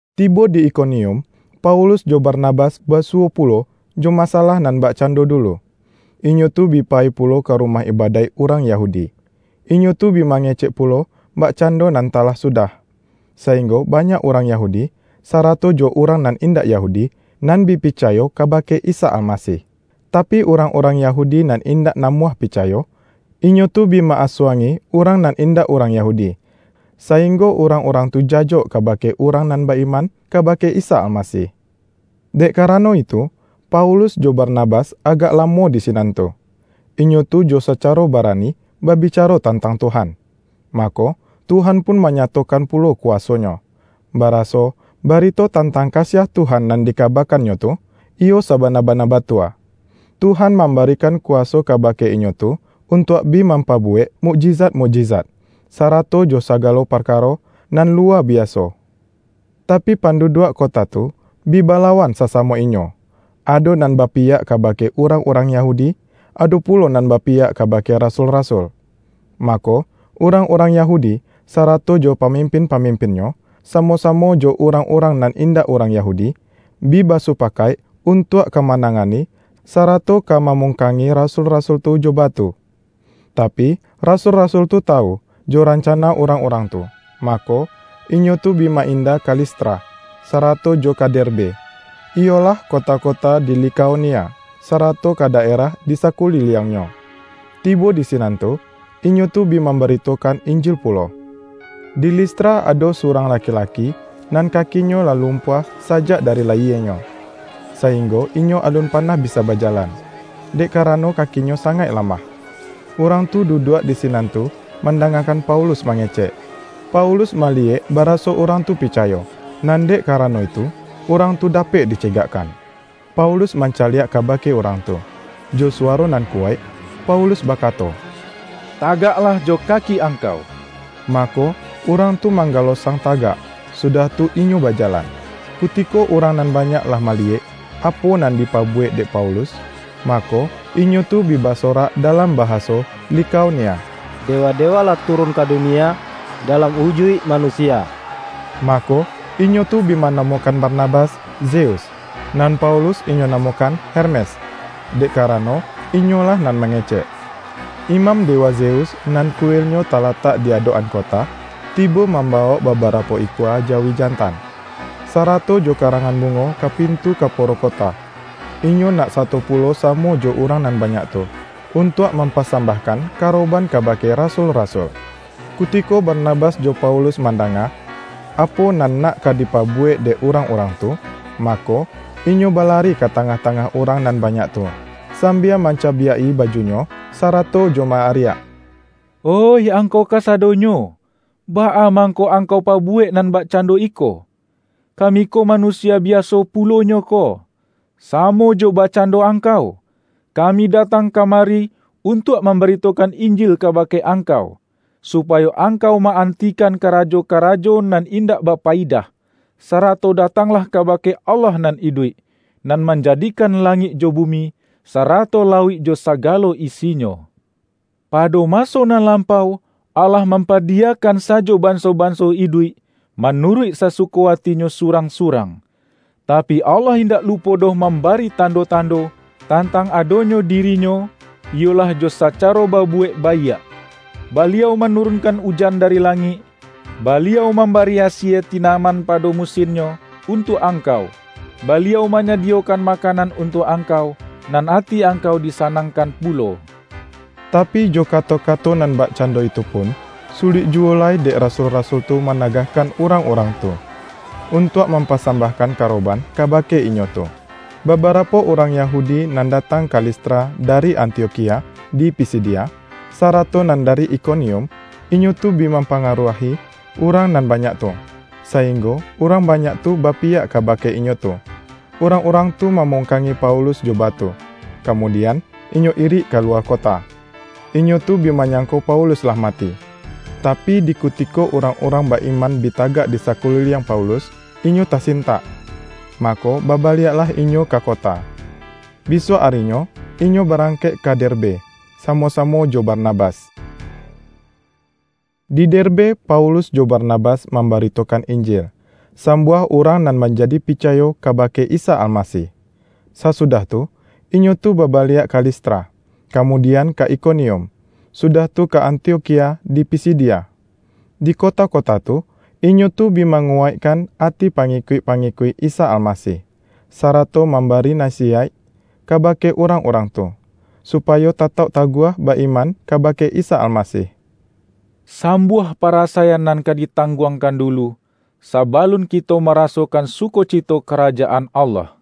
Tibo di Ikonium, Paulus jo Barnabas basuwo pulo jo masalah nan bakcando dulu. Inyo tu bi payi pulo ka rumah ibadaik urang Yahudi, inyo tu bi mangecek pulo bakcando nan talah sudah, sainggo banyak urang Yahudi, sarato jo urang nan indak Yahudi, nan bi picayo kabake Isa Almasih. Tapi, urang-urang Yahudi nan indak namuah picayo, inyo tu bi ma-asuang-i urang nan indak urang Yahudi, sainggo urangurang tu jajok kabake urang nan ba-iman kabake Isa Almasih. Dek karano itu, Paulus jo Barnabas agak lamo di sinan tu. Inyo tu jo sacaro barani babicaro tantang Tuhan. Mako, Tuhan pun manyatokan pulo kuwaso-Nyo, baraso, barito tantang kasiah Tuhan nan dikabakannyo tu, iyo sabana-bana batua; Tuhan mambarikan kuwaso kabake inyo tu untuak bi mampabuwek mukjizat-mukjizat, sarato jo sagalo parkaro nan luwa biaso. Tapi, panduduak kota tu, bi balawan sasamo inyo; ado nan bapiyak kabake urang-urang Yahudi, ado pulo nan bapiyak kabake rasul-rasul. Mako, urang-urang Yahudi, sarato jo pamimpin-pamimpinnyo, samo-samo jo urang-urang nan indak urang Yahudi, bi basupakaik untuak ka manangani, sarato ka mamungkangi rasul-rasul tu jo batu. Tapi, rasul-rasul tu tawu, jo rancana urang-urang tu, mako, inyo tu bi ma-inda ka Listra, sarato jo ka Derbe, iyolah kota-kota di Likaonia, sarato ka daerah di sakuliliangnyo. Tibo di sinan tu, inyo tu bi mambaritokan Injil pulo. Di Listra ado surang laki-laki, nan kakinyo lah lumpuah sajak dari layienyo, sainggo inyo alun panah bisa bajalan, dek karano kakinyo sangaik lamah. Urang tu duduak di sinan tu mandangakan Paulus mangecek. Paulus maliyek baraso urang tu picayo, nan dek karano itu urang tu dapek dicegakkan. Paulus mancaliak kabake urang tu, jo suwaro nan kuwaik Paulus bakato,”Tagaklah jo kaki angkau!” Mako, urang tu manggalosang tagak, sudah tu inyo bajalan. Kutiko urang nan banyak lah maliyek, apo nan dipabuwek dek Paulus, mako, inyo tu bi basorak dalam bahaso Likaonia,”Dewa-dewa lah turun ka dunie dalam ujuik manusia.” Mako, inyo tu bi manamokan Barnabas Zeus, nan Paulus inyo namokan Hermes, dek karano inyolah nan mangecek. Imam dewa Zeus, nan kuilnyo talatak di adok-an kota, tibo mambawok babarapo ikua jawi jantan, sarato jo karangan bungo ka pintu kaporo kota. Inyo nak sato pulo samo jo urang nan banyak tu, untuak mampasambahkan karoban kabake rasul-rasul. Kutiko Barnabas jo Paulus ma-ndanga, apo nan nak ka dipabuwek dek urang-urang tu, mako, inyo balari ka tangah-tangah urang nan banyak tu, sambia mancabiak-i bajunyo, sarato jo ma-ariak, ”Oih angkau kasadonyo, baa mangko angkau pabuwek nan bakcando iko? Kami ko manusia biaso pulo nyo ko, samo jo bakcando angkau! Kami datang kamari untuak mambaritokan Injil kabake angkau, supayo angkau ma-antikan karajo-karajo nan indak bapayidah, sarato datanglah kabake Allah nan iduik, nan manjadikan langik jo bumi, sarato lauik jo sagalo isinyo. Pado maso nan lampau, Allah mampadiyakan sajo banso-banso iduik manuruik sasuko atinyo surang-surang. Tapi, Allah indak lupo doh mambari tando-tando, tantang adonyo diri-Nyo, iyolah jo sacaro babuwek baiak. Baliau manurunkan ujan dari langik, Baliau mambari asie tinaman pado musinnyo, untuak angkau. Baliau manyadiyokan makanan untuak angkau, nan ati angkau disanangkan pulo.” Tapi, jo kato-kato nan bakcando itu pun, sulik juwo lai dek rasul-rasul tu managahkan urang-urang tu, untuak mampasambahkan karoban kabake inyo tu. Babarapo urang Yahudi nan datang ka Listra dari Antiokhia di Pisidia, sarato nan dari Ikonium, inyo tu bi mampangaruahi urang nan banyak tu, sainggo urang banyak tu bapiyak kabake inyo tu. Urang-urang tu mamungkangi Paulus jo batu, kamudian, inyo irik kaluwa kota. Inyo tu bi manyangko Paulus lah mati, tapi, di kutiko urang-urang ba-iman bi tagak di sakuliliang Paulus, inyo tasintak, mako babaliaklah inyo ka kota. Bisuak arinyo inyo barangkek ka Derbe, samo-samo jo Barnabas. Di Derbe Paulus jo Barnabas mambaritokan Injil, sambuah urang nan manjadi picayo kabake Isa Almasih. Sasudah tu, inyo tu babaliak ka Listra, kamudian ka Ikonium, sudah tu ka Antiokhia di Pisidia. Di kota-kota tu, inyo tu bi manguwaikkan ati pangikuik-pangikuik Isa Almasih, sarato mambari nasiyaik kabake urang-urang tu, supayo tatauk taguah ba-iman kabake Isa Almasih.”Sambuah parasaian nan ka ditangguangkan dulu, sabalun kito marasokan sukocito Karajaan Allah,”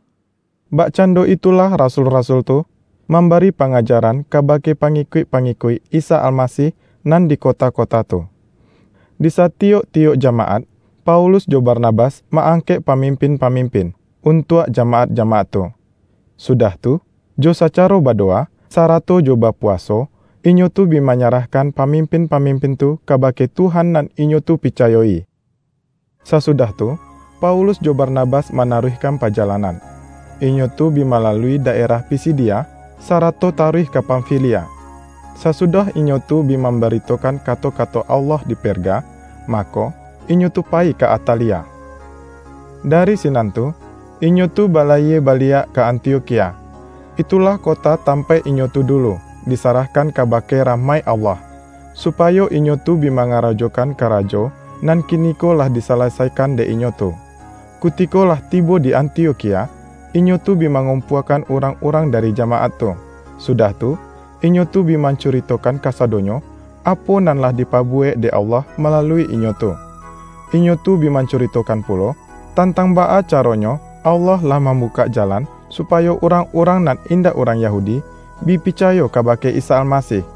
bakcando itulah rasul-rasul tu, mambari pangajaran kabake pangikuik-pangikuik Isa Almasih nan di kota-kota tu. Di satiyok-tiyok jamaat, Paulus jo Barnabas ma-angkek pamimpin-pamimpin, untuak jamaat-jamaat tu. Sudah tu, jo sacaro badowa, sarato jo bapuwaso, inyo tu bi manyarahkan pamimpin-pamimpin tu kabake Tuhan nan inyo tu picayo-i. Sasudah tu, Paulus jo Barnabas manaruihkan pajalanan, inyo tu bi malalui daerah Pisidia, sarato taruih ka Pamfilia. Sasudah inyo tu bi mambaritokan kato-kato Allah di Perga, mako, inyo tu payi ka Atalia. Dari sinan tu, inyo tu balayie baliak ka Antiokhia. Itulah kota tampaik inyo tu dulu, disarahkan kabake rahmaik Allah, supayo inyo tu bi mangarajokan karajo, nan kiniko lah disalasaikan dek inyo tu. Kutiko lah tibo di Antiokhia, inyo tu bi mangumpuakan urang-urang dari jamaat tu, sudah tu, inyo tu bi mancuritokan kasadonyo, apo nan lah dipabuwek dek Allah malalui inyo tu. Inyo tu bi mancuritokan pulo, tantang baa caronyo Allah lah mambukak jalan, supayo urang-urang nan indak urang Yahudi, bi picayo kabake Isa Almasih.